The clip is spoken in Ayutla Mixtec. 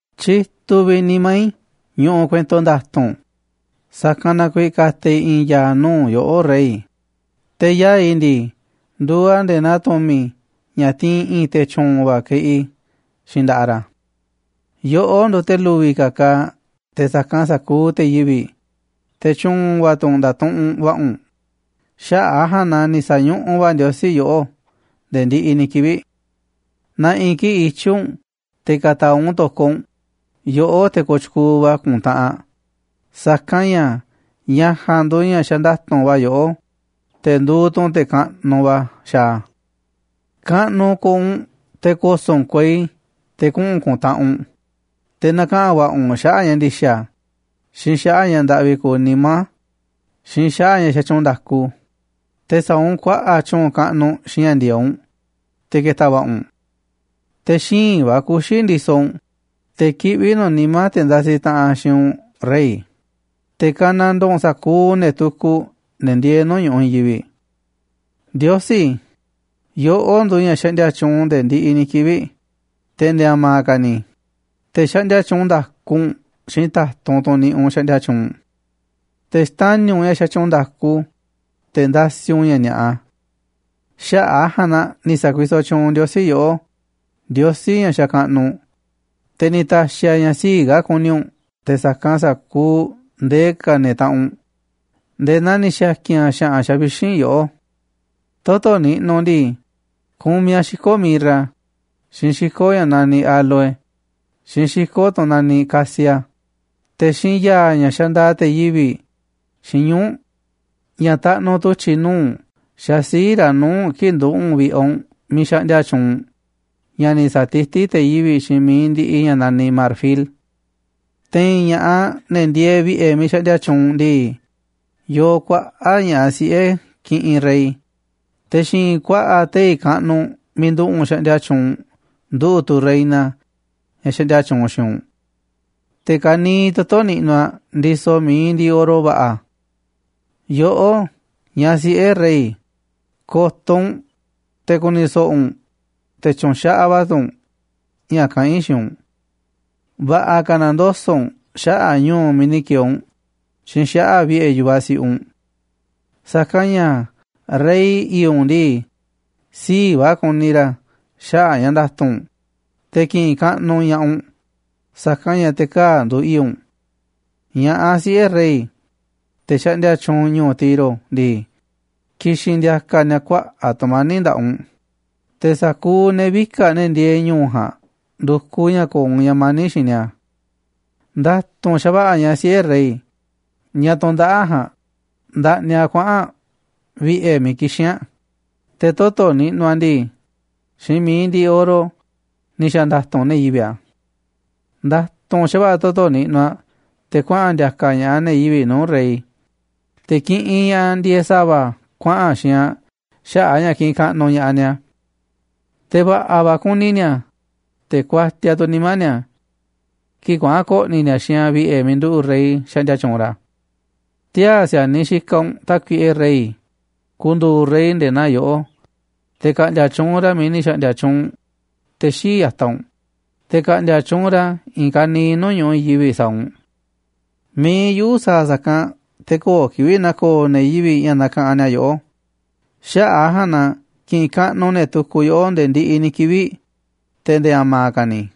Tyituꞌ vi̱ꞌ nimá i̱ ñuꞌuꞌ kuento nda̱tu̱nꞌ, sa̱kanꞌ na kuiiꞌ ka̱ta̱ i̱ i̱i̱n ya̱a̱ nuu̱ꞌ yoꞌó, rey, te̱ yaa̱ꞌ i̱ ndii, nduuꞌ a̱ nde̱e̱ naa tu̱mi̱ ña̱ tiinꞌ i̱i̱n te̱ tyu̱u̱n va̱ keꞌi xiinꞌ nda̱ꞌaꞌ ra̱. Yoꞌó nduuꞌ te̱ lu̱vi̱ ka̱ kaaꞌ te̱ sa̱kanꞌ sa̱kuuꞌ te̱ yivi̱ꞌ, te̱ tyu̱u̱n va̱ tu̱ u̱nꞌ nda̱tuꞌunꞌ va̱ꞌa̱ u̱nꞌ, xaꞌa̱ꞌ a̱ ja̱a̱nꞌ na ni̱ sa̱ñuꞌuꞌ va̱ Ndiosí yoꞌó nde̱e̱ ndiꞌiꞌ ni̱ kivi̱ꞌ. Na̱ꞌi̱ kiꞌi̱ꞌ ityi̱ u̱nꞌ te̱ ka̱ta̱a̱ u̱nꞌ u̱n to̱koꞌ u̱nꞌ, yoꞌó, te̱ kooꞌ tyukuuꞌ va̱ ku̱ntaꞌanꞌ, sa̱kanꞌ ña̱ ña̱ ja̱a̱nꞌ nduuꞌ ña̱ xanda̱tu̱nꞌ va̱ yoꞌó, te̱ nduuꞌ tu̱ u̱nꞌ te̱ kaꞌnuꞌ va̱ xaaꞌ a̱. Kaꞌnuꞌ ko̱o̱ u̱nꞌ te̱ ko̱so̱ꞌ u̱nꞌ kuei te̱ kuꞌu̱n ku̱ntaꞌanꞌ u̱nꞌ, te̱ na̱kaꞌa̱n va̱ꞌa̱ u̱nꞌ xaꞌa̱ꞌ ña̱ ndi̱xa̱, xiinꞌ xaꞌa̱ꞌ ña̱ ndaꞌvi kuuꞌ nimá, xiinꞌ xaꞌa̱ꞌ ña̱ xatyuunꞌ nda̱ku, te̱ sa̱a̱ u̱nꞌ kuaꞌa̱ꞌ tyu̱u̱n kaꞌnuꞌ xiinꞌ ña̱ ndi̱e̱eꞌ u̱nꞌ, te̱ ke̱ta̱ va̱ꞌa̱ u̱nꞌ. Te̱ xíinꞌ va̱ kuxi̱ ndisoꞌ u̱nꞌ, te̱ kiꞌví nu̱ꞌ nimá te̱ ndasiꞌ taꞌanꞌ xiinꞌ u̱nꞌ, rey, te̱ ka̱nandoo u̱nꞌ sa̱kuuꞌ ne̱ tukuꞌ, ne̱ ndieeꞌ nuu̱ꞌ ñu̱ꞌuꞌ i̱i̱n yivi̱ꞌ. Ndiosí, yoꞌó nduuꞌ ña̱ xaꞌndia tyuunꞌ nde̱e̱ ndiꞌiꞌ ni̱ kivi̱ꞌ, te̱ nde̱e̱ a̱ma̱ ka̱ ni̱, te̱ xaꞌndia tyuunꞌ nda̱ku u̱nꞌ xiinꞌ ta̱tunꞌ, tunꞌ niꞌiꞌ u̱nꞌ xaꞌndia tyuunꞌ. Te̱ xtani̱ u̱nꞌ ña̱ xatyuunꞌ nda̱ku, te̱ ndasiꞌ u̱nꞌ ña̱ ni̱a̱ꞌa. Xaꞌa̱ꞌ a̱ ja̱a̱nꞌ na ni̱ sa̱kuisoꞌ tyuunꞌ Ndiosí yoꞌó, Ndiosí ña̱ xakaꞌnuꞌ u̱nꞌ, te̱ ni̱ ta̱xi̱ a̱ ña̱ sii̱ꞌ ka̱ ku̱ni̱ u̱nꞌ te̱ sa̱kanꞌ sa̱kuuꞌ ndee ka̱ ne̱ taꞌanꞌ u̱nꞌ nde̱e̱ naa ni̱ xa̱ki̱n a̱ xa̱ꞌa̱n xavixínꞌ yoꞌó. Toto̱ niꞌnuꞌ u̱nꞌ ndii, kumiꞌ a̱ xiko̱ mirra, xiinꞌ xiko̱ ña̱ naniꞌ áloe, xiinꞌ xiko̱ tunꞌ naniꞌ casia. Te̱ xiinꞌ ya̱a̱, ña̱ xandaaꞌ te̱ yivi̱ꞌ, xiinꞌ ñuu̱ꞌ, ña̱ taꞌnuꞌ tu̱tyi̱ nuu̱ꞌ xaaꞌ sii̱ꞌ ra̱ nuu̱ꞌ u̱nꞌ kii̱ꞌ nduꞌu̱ꞌ u̱nꞌ vi̱ꞌe̱ u̱nꞌ miiꞌ xaꞌndia tyuunꞌ u̱nꞌ, ña̱ ni̱ sa̱tití te̱ yivi̱ꞌ xiinꞌ mi̱iꞌ ndiꞌiꞌ ña̱ naniꞌ marfil. Te̱i̱n ña̱ꞌaꞌ, ne̱ ndieeꞌ vi̱ꞌe̱ miiꞌ xaꞌndia tyuunꞌ u̱nꞌ ndii, yoo kuaꞌa̱ꞌ ña̱ꞌaꞌ siꞌe̱ kiꞌinꞌ rey, te̱ xi̱i̱nꞌ ku̱a̱ꞌa̱ tei̱ kaꞌnuꞌ miiꞌ nduꞌu̱ꞌ u̱nꞌ xaꞌndia tyuunꞌ u̱nꞌ nduꞌu̱ꞌ tu̱ reina ña̱ xaꞌndia tyuunꞌ xiinꞌ u̱nꞌ. Te̱ ka̱niiꞌ toto̱ niꞌnuꞌ aꞌ ndisoꞌ mi̱iꞌ ndiꞌiꞌ oro va̱ꞌa̱. Yoꞌó, ñaꞌ siꞌe̱ rey, ko̱to̱ u̱nꞌ, te̱ ku̱ni̱ so̱ꞌo̱ u̱nꞌ, te̱ tyu̱nxaꞌaꞌ va̱ tu̱ u̱nꞌ ña̱ kaꞌán i̱ xiinꞌ u̱nꞌ. Va̱ꞌa̱ ka̱ na̱ndoso̱ꞌ u̱nꞌ xaꞌa̱ꞌ ñu̱u̱ miiꞌ ni̱ ki̱e̱e̱ u̱nꞌ xiinꞌ xaꞌa̱ꞌ vi̱ꞌe̱ yu̱vaꞌ siꞌiꞌ u̱nꞌ. Sa̱kanꞌ ña̱ rey i̱i̱ꞌ u̱nꞌ ndii, sii̱ꞌ va̱ kuni ra̱ xaꞌa̱ꞌ ña̱ nda̱tu̱nꞌ u̱nꞌ, te̱ ki̱ꞌi̱n kaꞌnuꞌ ña̱ꞌaꞌ u̱nꞌ, sa̱kanꞌ ña̱ te̱ kaa̱ꞌ nduuꞌ i̱i̱ꞌ u̱nꞌ. Ña̱ꞌaꞌ siꞌe̱ rey, te̱ xaꞌndia tyuunꞌ ñu̱u̱ Tiro ndii, ki̱xi̱n ndi̱a̱ka̱ ni̱a̱ kuaꞌa̱ꞌ tu̱mani̱ꞌ nda̱ꞌaꞌ u̱nꞌ, te̱ sa̱kuuꞌ ne̱ vika̱ꞌ, ne̱ ndieeꞌ ñu̱u̱ ja̱a̱nꞌ, ndu̱kuꞌ ña̱ ko̱o̱ u̱nꞌ ña̱ mani̱ꞌ xiinꞌ ni̱a̱. Nda̱tu̱nꞌ xa̱va̱ꞌa̱ ñaꞌ siꞌe̱ rey, ñaꞌ tundaꞌáꞌ ja̱a̱nꞌ, ndaꞌniꞌ aꞌ kuaꞌa̱n aꞌ vi̱ꞌe̱ miiꞌ kixín aꞌ, te̱ toto̱ niꞌnuꞌ aꞌ ndii, xiinꞌ mi̱iꞌ ndiꞌiꞌ oro ni̱ xa̱ nda̱tu̱nꞌ ne̱ yivi̱ꞌ a̱. Nda̱tu̱nꞌ xa̱va̱ꞌa̱ toto̱ niꞌnuꞌ aꞌ, te̱ kuaꞌa̱n ndi̱a̱ka̱ ña̱ꞌaꞌ ne̱ yivi̱ꞌ nuu̱ꞌ rey, te̱ kiꞌinꞌ ña̱ꞌaꞌ ndieeꞌ sa̱va̱ kuaꞌa̱n xiinꞌ aꞌ xaꞌa̱ꞌ a̱ ña̱ kiꞌinꞌ kaꞌnuꞌ ña̱ꞌaꞌ ni̱a̱. Te̱ va̱ꞌa̱ va̱ kuni ni̱a̱, te̱ kuatiaꞌ tu̱ nimá ni̱a̱ kii̱ꞌ kuaꞌa̱n ko̱ꞌni̱ ni̱a̱ xiinꞌ aꞌ vi̱ꞌe̱ miiꞌ nduꞌu̱ rey xaꞌndia tyuunꞌ ra̱. Tiaa̱ si̱a̱niꞌ xikaꞌ u̱nꞌ, Tákuiꞌe rey, ku̱ndu̱u̱ rey nde̱e̱ naa yoꞌó, te̱ ka̱ꞌndi̱a̱ tyuunꞌ ra̱ miiꞌ ni̱ xa̱ꞌndi̱a̱ tyuunꞌ te̱ xii̱ꞌ ya̱taꞌ u̱nꞌ, te̱ ka̱ꞌndi̱a̱ tyuunꞌ ra̱ i̱i̱n ka̱niiꞌ nuu̱ꞌ ñu̱ꞌuꞌ i̱i̱n yivi̱ꞌ sa̱a̱ u̱nꞌ. Mi̱iꞌ yuꞌu̱ sa̱a̱ sa̱kanꞌ te̱ köo̱ꞌ kivi̱ꞌ na̱ko̱o̱ ne̱ yivi̱ꞌ ña̱ nakaꞌanꞌ ni̱a̱ yoꞌó, xaꞌa̱ꞌ a̱ ja̱a̱nꞌ na ki̱ꞌi̱n kaꞌnuꞌ ne̱ tukuꞌ yoꞌó nde̱e̱ ndiꞌiꞌ ni̱ kivi̱ꞌ, te̱ nde̱e̱ a̱ma̱ ka̱ ni̱.